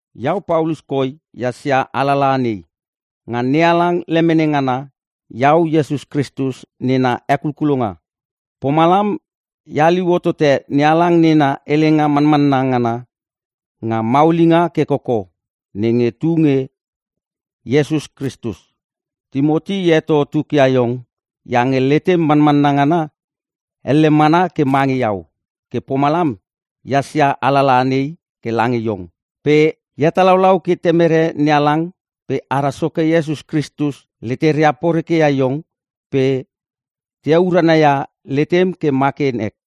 Iau Paulus koi ehas ia alalaha nei. Nga NeHalang lemene, ngana iau Iesus Kritus nena hekulkulonga. Pomalam e haliu hotote NeHalang nena helenga manmanna ngana nga maulinga ke koko nenge tunge Iesus Kristus. Timoti, e heto tukia iong iange letem manmanna ngana elle mana ke mange iau. Ke pomalam ehas ia alalaha nei ke lange iong. Pe e hetalaulau ke Temere NeHalang pe ara Soke Iesus Kristus leteria poreke ia iong pe te heurana ia letem ke ma ke nek.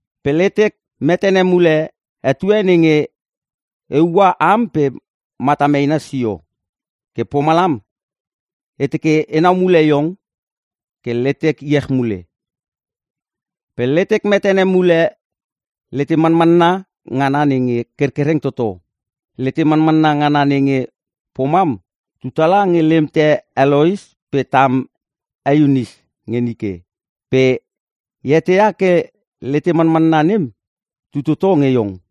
Pe letek metene mule etue nenge e ua am pe matam eina sio. Ke pomalam e teke enau mule iong ke letek iech mule. Pe letek metene mule letem manmanna ngana nenge kerkereng toto. Lete manmanna ngana nenge pomam tu tala nge lemte he Lois pe tam e Iunis nge nike. Pe e eteia ke lete manmanna nem tu toto nge iong.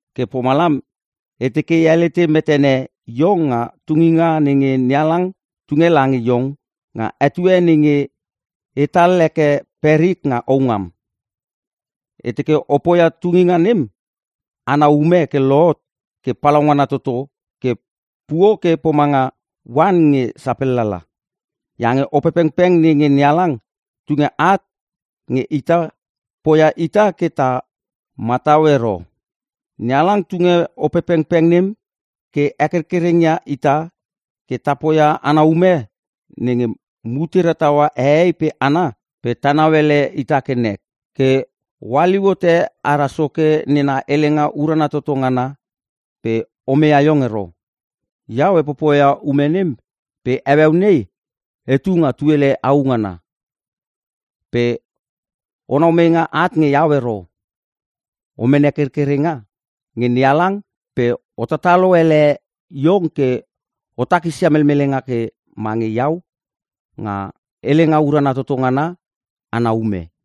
Ke pomalam e teke e helete metene iong nga tunginga nenge NeHalang tunge lange iong nga etue nenge etal heke perik nga houngam. E teke o poia tunginga nem ana ume ke lohot ke palaungana toto ke puo ke pomanga oan nge sapellala. Iange Opepengpeng nenge NeHalang tunge at nge ita poia ita ke ta matau ero. NeHalang tunge Opepengpeng nem ke hekerkereng ia ita ke ta poia ana ume nenge mutera taua hehei pe hana pe ta nauele ita ke nek. Ke o haliu hote ara Soke nena helenga urana toto ngana pe omeia iong ero. Iau e popoia ume nem pe heueu nei etu nga tuele au ngana. Pe onau meinga at nge iau ero. O mene kerkerenga nge NeHalang pe o tatalo ele iong ke o takisia melmelenga ke mange iau nga helenga urana toto ngana ana ume.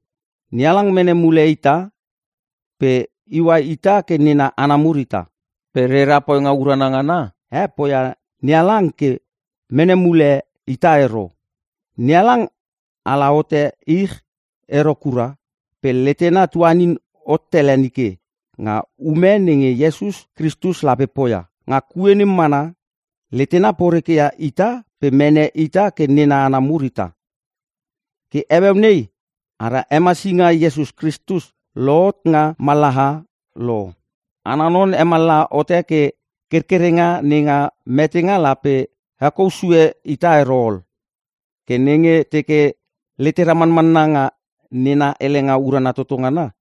NeHalang mene mule ita pe iua ita ke nena hana mur ita. Pe rera poinga urana ngana e poia NeHalang ke mene mule ita ero. NeHalang ala hote ich ero kura pe letena tuanin hot tele nike nga ume nenge Iesus Kristus lape poia. Nga kue nem mana letena porekeia ita pe mene ita ke nena hana mur ita. Ke heueu nei ara Hemasinga Iesus Kristus lohot nga mallaha lo. Ana non hemallaha hote ke kerkerenga nenga metenga lape hekou sue ita ero ol. Ke nenge teke letera manmanna nga nena helenga urana toto ngana,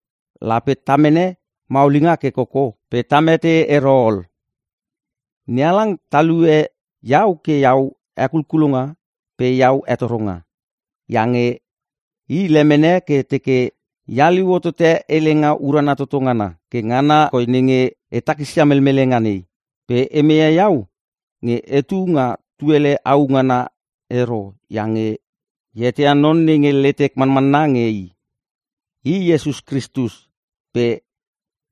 lape ta mene maulinga ke koko pe ta mete ero ol. NeHalang talue iau ke iau hekulkulonga pe iau hetoronga, iange i lemene ke teke e haliu hotote helenga urana toto ngana. Ke ngana koi nenge e takisia melmelenga nei. Pe e meia iau nge etu nga tuele au ngana ero iange e eteia non nenge letek manmanna nge i. I Iesus Kristus pe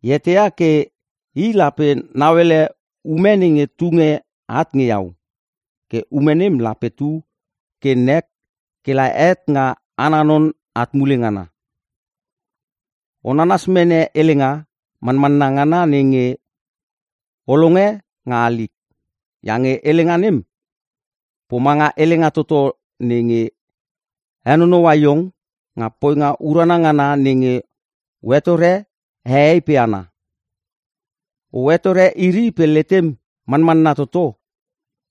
e eteia ke i lape nauele ume nenge tunge at nge iau, ke ume nem lape tu ke nek kela het nga ana non at mule ngana. O nanas mene helenga manmanna ngana nenge o longe nga halik. Iange helenga nem pomanga helenga toto nenge henonoua iong nga poinga urana ngana nenge o hetore hehei pe hana. O hetore iri pe letem manmanna toto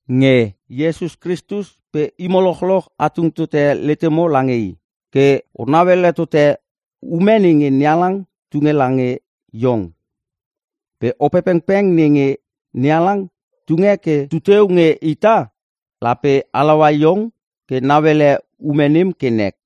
nge Iesus Kristus pe imo lochloch a tung tote letemo lange I. Ke o nauele tote ume nenge NeHalang tunge lange iong. Pe Opepengpeng nenge NeHalang tunge ke tuteu nge ita, lape halaua iong ke nauele ume nem ke nek.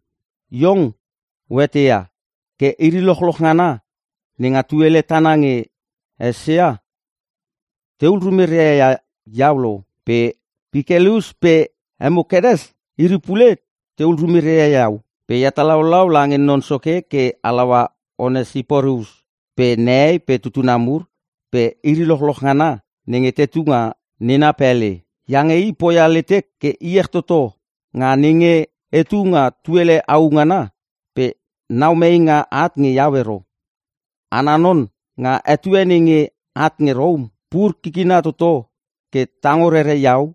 Iong, o eteia ke iri lochloch ngana nenga tuele tana nge Eisia tehul rumeria ia iau lo. Pe Pikelus pe Hemokenes iri pule tehul rumeria ia iau. Pe e hetalaulau lange Non Soke ke halaua Onesiporus pe nehei pe tutuna mur pe iri lochloch ngana nenge tetu nga nena pele. Iange i poia letek ke iech toto nga nenge etu nga tuele au ngana pe nau meinga at nge iau ero. Ana non, nga etue nenge at nge Rom pur kikina toto ke tango rere iau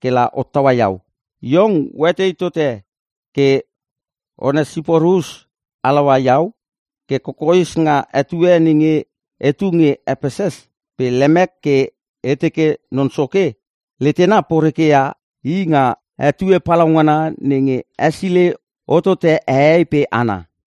kela hottaua iau. Iong oetei tote ke Onesiporus halaua iau ke kokoes nga etue nenge etu nge Epeses. Pe lemek ke e teke Non Soke letena porekeia i nga etue palaungana nenge hesilei hotote hehei pe hana.